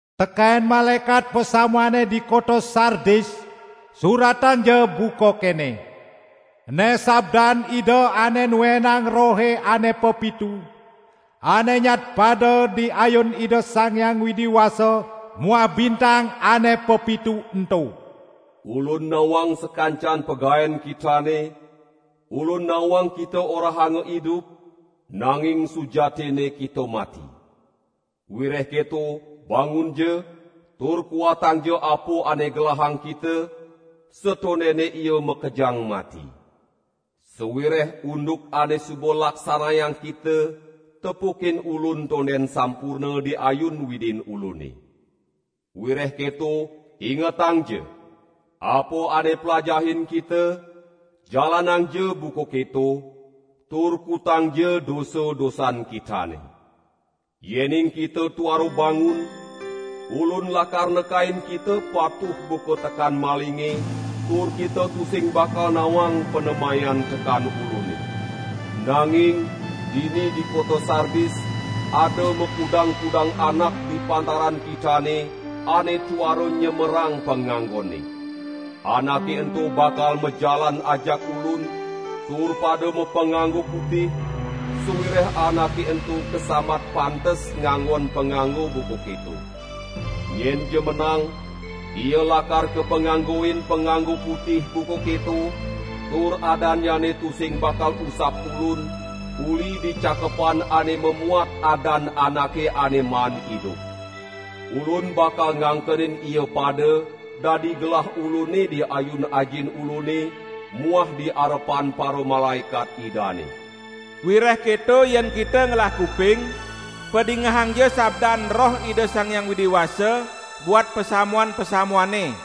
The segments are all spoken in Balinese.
"Teken malaekat pasamuane di kota Sardis suratangja buka kene: Ene sabdan Ida ane nuenang rohe ane pepitu, ane nyadpada di ayun Ida Sang Hyang Widi Wasa muah bintang ane pepitu ento. Ulun nawang sakancan pagaen kitane, Ulun nawang kita orahanga idup, nanging sujatinne kita mati! Wireh keto bangunja, tur kuatangja apa ane gelahang kita, satondene ia makejang mati. Sawireh unduk ane suba laksanayang kita, tepukin Ulun tonden sampurna di ayun Widin Ulune. Wireh keto ingetangja! Apa ane plajahin kita, jalanangja buka keto, tur kutangja dosa-dosan kitane. Yening kita tuara bangun, Ulun lakar nekain kita patuh buka tekan malinge, tur kita tusing bakal nawang panemayan tekan Ulune. Nanging dini di kota Sardis ada makudang-kudang anak di pantaran kitane ane tuara nyemerang panganggonne. Anake ento bakal majalan ajak Ulun, tur pada mapanganggo putih, sawireh anake ento kasambat pantes nganggon panganggo buka keto. Nyenja menang, ia lakar kapanganggoin panganggo putih buka keto, tur adannyane tusing bakal usap Ulun uli di cakepan ane mamuat adan anake ane maan idup. Ulun bakal ngangkenin ia pada dadi gelah Ulune di ayun Ajin Ulune muah di arepan paramalaekat Idane. Wireh keto yen kita ngelah kuping, padingehangja sabdan Roh Ida Sang Hyang Widi Wasa, buat pasamuan-pasamuane!"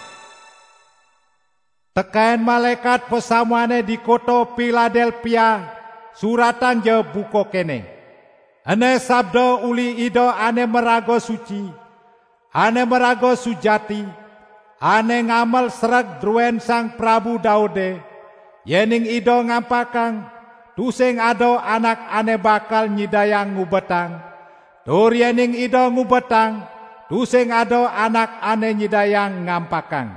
"Teken malaekat pasamuane di kota Piladelpia suratangja buka kene: Ene sabda uli Ida ane maraga suci, ane maraga sujati, ane ngamel sereg druen Sang Prabu Daude; yening Ida ngampakang, tusing ada anak ane bakal nyidayang ngubetang, tur yening Ida ngubetang, tusing ada anak ane nyidayang ngampakang.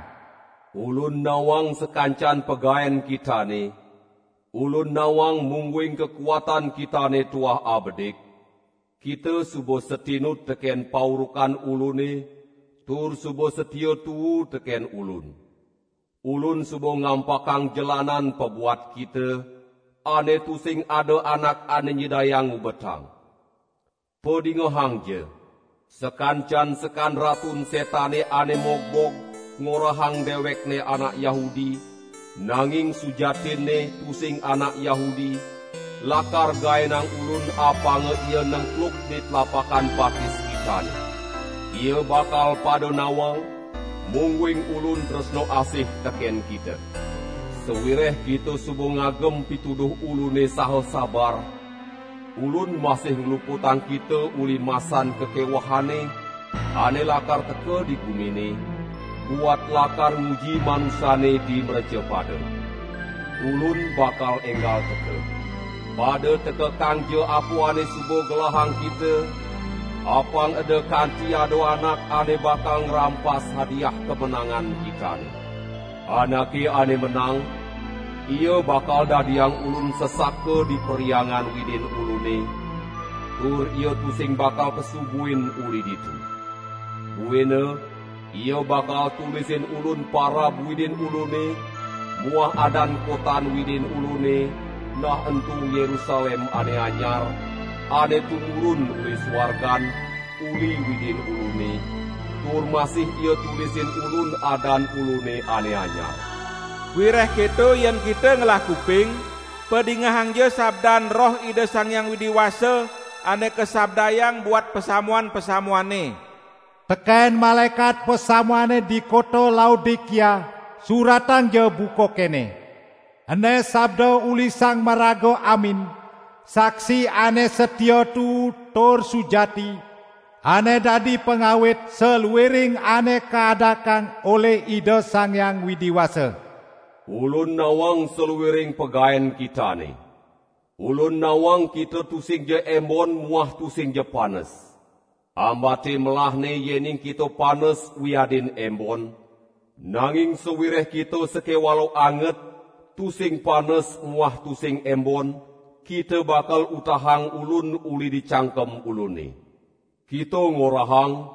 Ulun nawang sakancan pagaen kitane, Ulun nawang mungguing kakuatan kitane tuah abedik; kita suba satinut teken paurukan Ulune, tur suba satia tuu teken Ulun. Ulun suba ngampakang jelanan pabuat kita, ane tusing ada anak ane nyidayang ngubetang. Padingehangja! Sakancan sekan Ratun Setane ane mogbog ngorahang dewekne anak Yahudi, nanging sujatinne tusing anak Yahudi, lakar gaenang Ulun apanga ia nengkluk di tlapakan batis kitane. Ia bakal pada nawang, mungguing Ulun tresna asih teken kita. Sawireh kita suba ngagem pituduh Ulune saha sabar, Ulun masih ngluputang kita uli masan kakewehane ane lakar teka di gumine, buat lakar nguji manusane di mrecapada. Ulun bakal enggal teka. Pada tekekangja apa ane suba gelahang kita, apang eda kanti ada anak ane bakal ngrampas hadiah kamenangan kitane. Anake ane menang, ia bakal dadiang Ulun sesaka di Perhyangan Widin Ulune; tur ia tusing bakal pesu buin uli ditu. Buina ia bakal tulisin Ulun parab Widin Ulune muah adan kotan Widin Ulune, nah ento Yerusalem ane anyar, ane tumurun uli suargan, uli Widin Ulune, tur masih ia tulisin Ulun adan Ulune ane anyar. Wireh keto yen kita ngelah kuping, padingehangja sabdan Roh Ida Sang Hyang Widi Wasa ane kasabdayang buat pasamuan-pasamuane." "Teken malaekat pasamuane di kota Laodikia suratangja buka kene: Ene sabda uli Sang Maraga Amin, saksi ane satia tuu tur sujati, ane dadi pangawit saluiring ane kaadakang olih Ida Sang Hyang Widi Wasa. Ulun nawang saluiring pagaen kitane. Ulun nawang kita tusingja embon muah tusingja panes. Ambate melahne yening kita panes wiadin embon, nanging sawireh kita sakewala anget, tusing panes muah tusing embon, kita bakal utahang Ulun uli di cangkem Ulune. Kita ngorahang: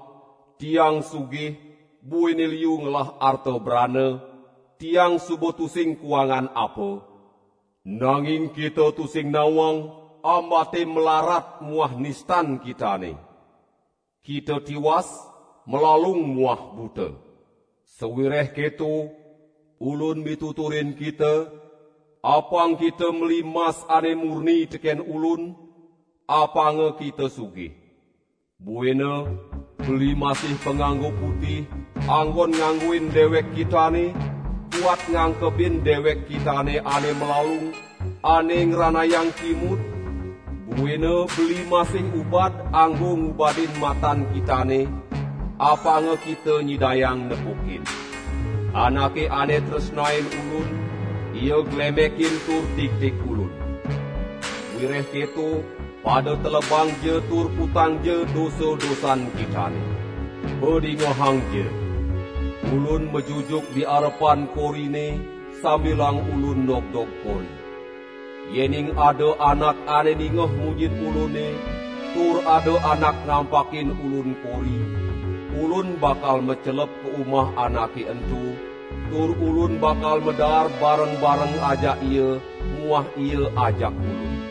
'Tiang sugih, buina liu ngelah arta brana, tiang suba tusing kuangan apa!' Nanging kita tusing nawang ambate mlarat muah nistan kitane. Kita tiwas, malalung muah buta. Sawireh keto, Ulun mituturin kita, apang kita meli mas ane murni teken Ulun, apanga kita sugih. Buina beli masih panganggo putih, anggon nganggoin dewek kitane, buat ngangkebin dewek kitane ane malalung, ane ngranayang kimud, buina beli masih ubad anggo ngubadin matan kitane, apanga kita nyidayang nepukin. Anake ane tresnain Ulun, ia glemekin tur tigtig Ulun. Wireh keto pada telebangja tur kutangja dosa-dosan kitane. Padingehangja! Ulun majujuk di arepan korine sambilang Ulun nogdog kori; yening ada anak ane ningeh munyin Ulune tur ada anak ngampakin Ulun kori, Ulun bakal macelep ka umah anake ento, tur Ulun bakal madaar bareng-bareng ajak ia muah ia ajak Ulun.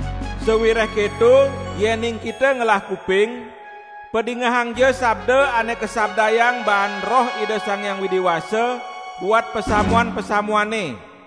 Sawireh keto yening kita ngelah kuping, padingehangja sabda ane kasabdayang baan Roh Ida Sang Hyang Widi Wasa buat pasamuan-pasamuane!"